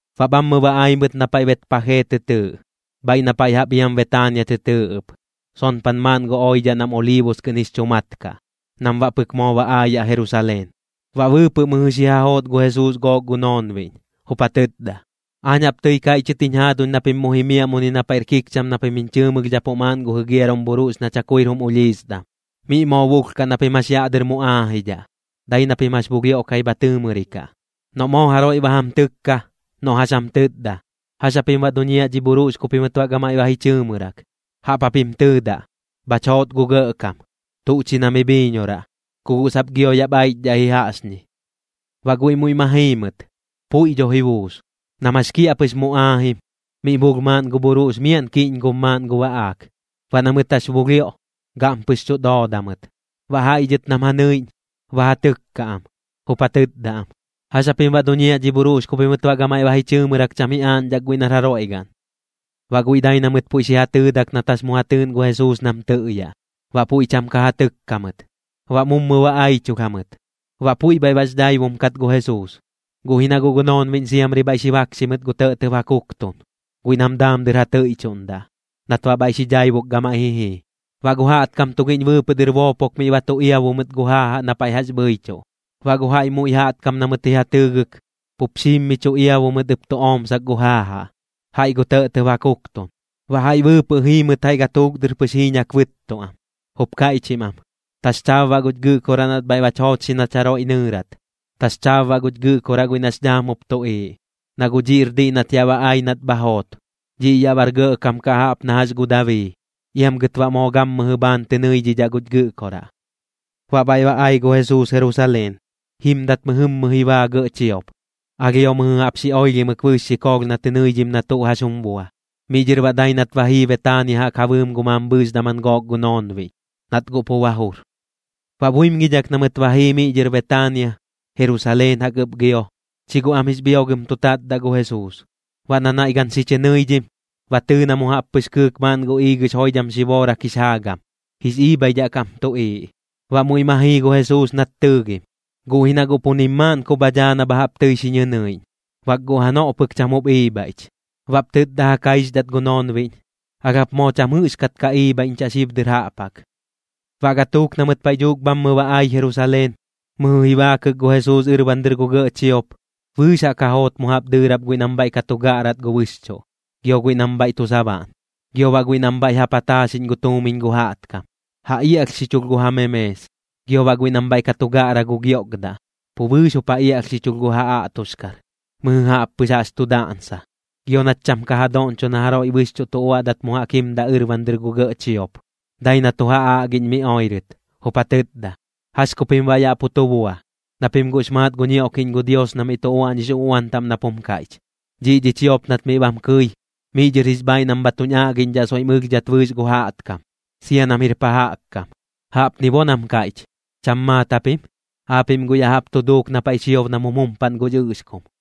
Baꞌ bhammɨ ba ai mɨt na paiꞌ Betpajee tɨ tɨɨꞌ, bhaiꞌ na paiꞌ jaꞌp iam Betaania tɨ tɨɨꞌ ɨp, sonpan maaꞌn gu oidhaꞌ nam Oliibus kɨꞌn jix chu mat kaꞌ, nam baꞌ pɨk moo ba aayaꞌ Jerusaleen. Baꞌ bɨɨpɨꞌ mɨjɨ xi ja joot gu Jesuus gook gu noonbiꞌñ, jup ja tɨtda: ―Aañ jaꞌp tɨi kaiꞌchɨt jiñ jaaduñ na pim mu jimiaꞌ muni na paiꞌr kikcham na pim jiñ chɨɨmɨlhdhapuꞌ maaꞌn gu jigiarum bhuruꞌx na chakuir jum ulhisdam. Miꞌ moo bulhkaꞌ na pim jax yaꞌ dɨr mu aajidhaꞌ, dai na pim jax bulhioꞌkai bha tɨɨmɨrikaꞌ. Noꞌ moo jaroiꞌ ba jam tɨkka, noꞌ jax jam tɨtda: “¿Jax japim baꞌ duñiaꞌ dhi bhuruꞌx ku pimɨt baꞌ gamaiꞌ ba ji chɨɨmɨrak?”, jaꞌp japim tɨɨdaꞌ: “Bhach joot gu Gɇꞌkam. Tuꞌ chi na mi bhiiñoraꞌ. Ku guꞌ sap gio yaꞌp aichdhaꞌ ji jaꞌxñi.” Baꞌ guiꞌ muiꞌ ma jii mɨt, puiꞌ dho ji buus. Nam jax kiaꞌpɨx mu aajim, miꞌ bulh maaꞌn gu bhuruꞌx miaꞌn kiꞌñgob maaꞌn gu baꞌaak. Baꞌ na mɨt jax bulhioꞌ, gaꞌmpɨx chuꞌ dooda mɨt. Baꞌ jaiꞌ dhɨt nam ja nɨiꞌñ, ba ja tɨkka am, jup ja tɨtda am: ―¿Jax japim baꞌ duñiaꞌ dhi bhuruꞌx ku pimɨt baꞌ gamaiꞌ ba ji chɨɨmɨrak cham ji aaꞌñdhak guiꞌ nar jaroiꞌ gaꞌn? Baꞌ guiꞌ dai na mɨt puiꞌ xi ja tɨɨdak nat jax mu ja tɨɨꞌn gu Jesuus nam tɨꞌyaꞌ, baꞌ puiꞌ cham ka ja tɨkka mɨt. Baꞌ mummu ba aichulh jamɨt. Baꞌ puiꞌ bhaiꞌ bax dhaibum kat gu Jesuus, guꞌ ji na guꞌ gu noonbiꞌñ siamri bhaiꞌ xi bakxi mɨt gu tɇꞌtɇb ja kuktun, guiꞌ nam daam dɨr ja tɨiꞌchuꞌndaꞌ, nat baꞌ bhaiꞌ xi dhaibuk gamaiꞌ ji jii. Baꞌ gu jaꞌtkam tugiꞌñ bɨɨpɨꞌ dɨr boopok miꞌ ba tu iabu mɨt gu jaajaꞌ na paiꞌ jax bhɨichuꞌ. Baꞌ gu jaiꞌ muiꞌ jaꞌtkam na mɨt ji ja tɨɨgɨk, pup xiim mi chu iabu mɨt ɨp tu oꞌmsak gu jaajaꞌ, jaiꞌ gu tɇꞌtɇb ja kuktun. Baꞌ jaiꞌ bɨɨpɨꞌ jii mɨt jaiꞌ gatuuk dɨr pɨx jiiñak bɨɨt am, jup kaiꞌchim am: ―¡Taxchaab baꞌ guch Gɨꞌkoraꞌ nat bhaiꞌ bach joochxi nach jaroiꞌ nɨɨrat! ¡Taxchaab baꞌ guch Gɨꞌkoraꞌ guiꞌ nax dhaam jup tuꞌiiꞌ! Na guꞌ dhiꞌr diꞌ nat yaꞌ ba ai nat bha joot, dhiꞌ yaꞌ bar gɇꞌkam kaꞌ jaꞌp na jax gu Dabii. Iam gɨt baꞌ moo gammɨjɨ bhaan tɨ nɨiꞌñdhaꞌ guch Gɨꞌkoraꞌ. Baꞌ bhaiꞌ ba ai gu Jesuus Jerusaleen. Jimdat mɨjɨmmɨ ji baa gɇꞌ chiop, alhio mɨjɨ jaꞌp xi oilhimɨk bɨɨx xikoolh na tɨ nɨidhim na tuꞌ jax jum bua. Miꞌ dhɨr baꞌ dai nat ba jii Betaania jaꞌk ja bɨɨm gu mambhɨɨx daman gook gu noonbiꞌñ, nat guꞌ pu ba jur. Baꞌ buimgidhak na mɨt ba jii miꞌ dhɨr Betaania, Jerusaleen jaꞌk ɨp gio, chi guꞌ am jix bhiogɨm tu tatdaꞌ gu Jesuus. Baꞌ na naiꞌ gan xi chɨ nɨidhim, ba tɨɨ na mu jaꞌp pɨx kɨɨk maaꞌn gu iigɨx joidham xiboorak jix jaagam, jix iibhaidhaꞌ kam tuꞌiiꞌ. Baꞌ muiꞌ ma jii gu Jesuus nat tɨɨgim, guꞌ ji na guꞌ pu nim maaꞌn ku bha dhaa na bha jaꞌp tɨi xi ñɨnɨiꞌñ, bak guꞌ janoꞌ pɨk cham jup iibhaiꞌch. Baꞌp tɨtda ja kaixdhat gu noonbiꞌñ: ―¡Alh jap moo cham jɨꞌxkat ka iibhaiꞌñchaꞌ xib dɨr jaꞌp jaꞌk! Baꞌ gatuuk na mɨt paiꞌ dhuuk bhammɨ ba ai Jerusaleen, mɨjɨ ji baakɨk gu Jesuus ɨrban dɨr gu gɇꞌ chiop, bɨɨx jaꞌk ja joot mu jaꞌp dɨɨrap guiꞌ nam bhaiꞌ ka tu gaꞌrat gu bɨxchuꞌ, gio guiꞌ nam bhaiꞌ tu sabaꞌn. Gio baꞌ guiꞌ nam bhaiꞌ ja pataaxiꞌñ gu tuumiñ gu jaꞌtkam, ja iaꞌlhxichulh gu ja memees. Gio baꞌ guiꞌ nam bhaiꞌ ka tu gaꞌra gu giokdaꞌ, pu bɨɨx jup ja iaꞌlhxichulh gu ja aꞌtoxkar, mɨjɨ jaꞌp pɨx jaꞌx tu daꞌnsa. Gio nat cham ka ja doꞌñcho na jaroiꞌ bɨxchuꞌ tu uaꞌdat mu jaꞌk jimdaꞌ ɨrban dɨr gu gɇꞌ chiop, dai na tu ja aꞌgiꞌñ mi oirɨt, jup ja tɨtda: ―¿Jax ku pim baꞌ yaꞌ pu tu bua? Na pim guꞌx maat gu ñioꞌkiꞌñ gu Dios na miꞌ tu uaꞌñix uꞌuan taꞌm nap jum kaiꞌch: “Dhiꞌ dhi chiop nat miꞌ bam kɨi, miꞌ dhɨr jix bhaaiꞌ nam bha tuñ aꞌgiꞌñdhaꞌ soiꞌm ɨlhdhat bɨɨx na jɨꞌk jaꞌtkam, sia nam jir pa jaꞌk kam.” Jaꞌpni bo nam kaiꞌch, ¿cham maat japim? Aapiꞌm guꞌ ya jaꞌp tu duuk na paiꞌ chiob nam jum jumpaꞌn gu ɨꞌxkum.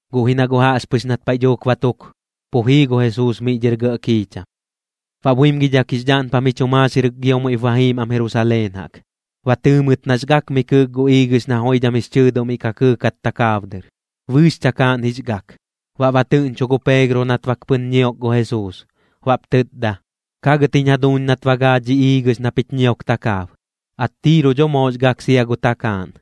guꞌ ji na guꞌ jaꞌxpɨx nat paiꞌ dhuuk ba tuk, pu jii gu Jesuus miꞌ dhɨr gɇꞌ kiicham. Baꞌ buimgidhak jix dhaꞌnpam ji chu maaxirɨk gio muiꞌp ba jiim am Jerusaleen jaꞌk. Ba tɨɨ mɨt nax gak mi kɨɨk gu iigɨx na joidham jix chɨɨduꞌ miꞌ ka kɨɨkat takaab dɨr, bɨɨx chakaaꞌn jix gak. Baꞌ ba tɨꞌñchu gu Peegro nat bak pɨn ñiok gu Jesuus, baꞌp tɨtda: ―Kagɨt jiñ jaduuñ nat ba gaa dhi iigɨx na pich ñiok takaab. Attiiru dho moox gak sia gu takaaꞌn.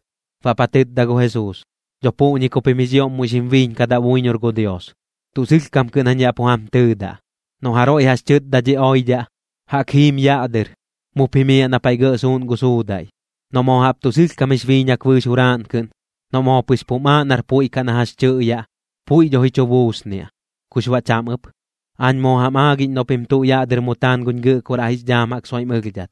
Baꞌp ja tɨtda gu Jesuus: ―Dho puꞌñi ku pim jix ioꞌm muiꞌ xim biiñkadaꞌ buiñor gu Dios. Tuꞌ sɨlhkam kɨꞌn jañ yaꞌ pu jam tɨɨdaꞌ, noꞌ jaroiꞌ jax tɨtda dhi oidhaꞌ: “Jaꞌk jim yaꞌ dɨr, mup jimiaꞌ na paiꞌ gɇꞌ suuꞌn gu suudaiꞌ”, noꞌ moo jaꞌp tuꞌ sɨlhkam jix biiñak bɨɨx juraaꞌn kɨꞌn, noꞌ moo pɨx pum aaꞌ nar puiꞌ kaꞌ na jax tɨꞌyaꞌ, puiꞌ dho ji chu buusniaꞌ, kux baꞌ cham ɨp. Aañ moo jam aagiꞌñ noꞌ pim tuꞌ yaꞌ dɨr mu taan guñ Gɨꞌkoraꞌ jix dhaam jaꞌk soiꞌm ɨlhdhat,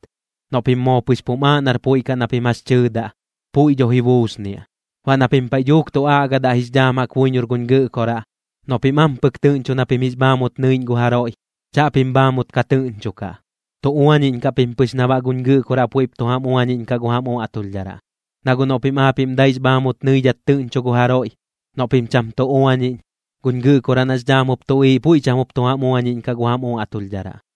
noꞌ pim moo pɨx pum aaꞌ nar puiꞌ kaꞌ na pim jax tɨɨdaꞌ, puiꞌ dho ji buusniaꞌ. Baꞌ na pim paiꞌ dhuuk tu aꞌgadaꞌ jix dhaam jaꞌk buiñor guñ Gɨꞌkoraꞌ, noꞌ pim ampɨk tɨꞌñchu na pim jix bhaamut nɨiꞌñ gu jaroiꞌ, chaꞌpim bhaamut ka tɨꞌñchukaꞌ, tu uañiꞌñkaꞌ pim pɨx na baꞌ guñ Gɨꞌkoraꞌ puiꞌp tu jam uañiꞌñkaꞌ gu jam uaꞌtulhdharaꞌ. Na guꞌ noꞌ pim aapiꞌm daix bhaamut nɨidhat tɨꞌñchu gu jaroiꞌ, noꞌ pim cham tu uañiꞌñ, guñ Gɨꞌkoraꞌ nax dhaam jup tuꞌiiꞌ puiꞌ cham jup tu jam uañiꞌñkaꞌ gu jam uaꞌtulhdharaꞌ.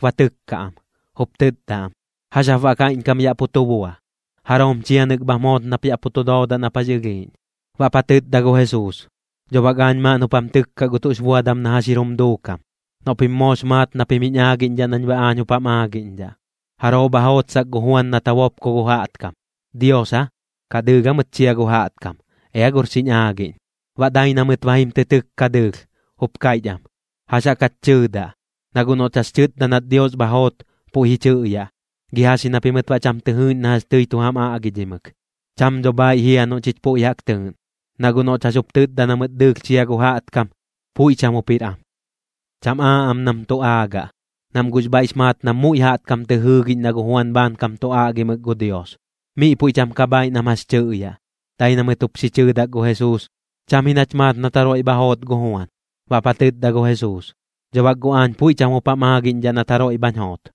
ba tɨkka am, jup tɨtda am: ―¿Jax jap baꞌ kaiꞌñkam yaꞌ pu tu bua? ¿Jaroom chianɨk bham joot nap yaꞌ pu tu doodaꞌ nap jax ɨlhiiꞌñ? Baꞌp ja tɨtda gu Jesuus: ―Dho bak aañ maaꞌn jup jam tɨkkaꞌ gu tuꞌx buadam na jax jir jum duukam, noꞌ pim moox maat na pim jiñ aagiꞌñdhaꞌ nañ baꞌ aañ jup jam aagiꞌñdhaꞌ. ¿Jaroo bha jootsak gu Juan nat ja bopko gu jaꞌtkam? ¿Dios aa, kaꞌ dɨɨlh aa mɨt chia gu jaꞌtkam? Ea gor xiñ aagiꞌñ. Baꞌ dai na mɨt ba jim tɨ tɨkka dɨɨlh, jup kaiꞌch am: ―¿Jax jaꞌk jach tɨɨdaꞌ? Na guꞌ noꞌch jax tɨtda nat Dios bha joot, puiꞌ ji chɨꞌyaꞌ: “¿Gi jax ji na pimɨt baꞌ cham tɨ jɨɨꞌñ na jax tɨi tu jam aꞌgidhimɨk?” Cham dho bhaiꞌ jia noꞌ chich puiꞌ jaꞌk tɨɨꞌn. Na guꞌ noꞌch jax jup tɨtda na mɨt dɨɨlh chia gu jaꞌtkam, puiꞌ cham jup jir am. Cham aaꞌ am nam tu aagaꞌ, nam guꞌx bhaiꞌx maat nam muiꞌ jaꞌtkam tɨ jɨɨgiꞌñ na gu Juan bhaankam tu aꞌgimɨk gu Dios. Miꞌ puiꞌ cham ka bhaiꞌ nam jax tɨꞌyaꞌ, dai na mɨt jup xi chɨɨdak gu Jesuus: ―Cham ji nach maat nat jaroiꞌ bha joot gu Juan. Baꞌp ja tɨtda gu Jesuus: ―Dho bak guꞌ aañ puiꞌ cham jup jam aagiꞌñdhaꞌ nat jaroiꞌ bhañ joot.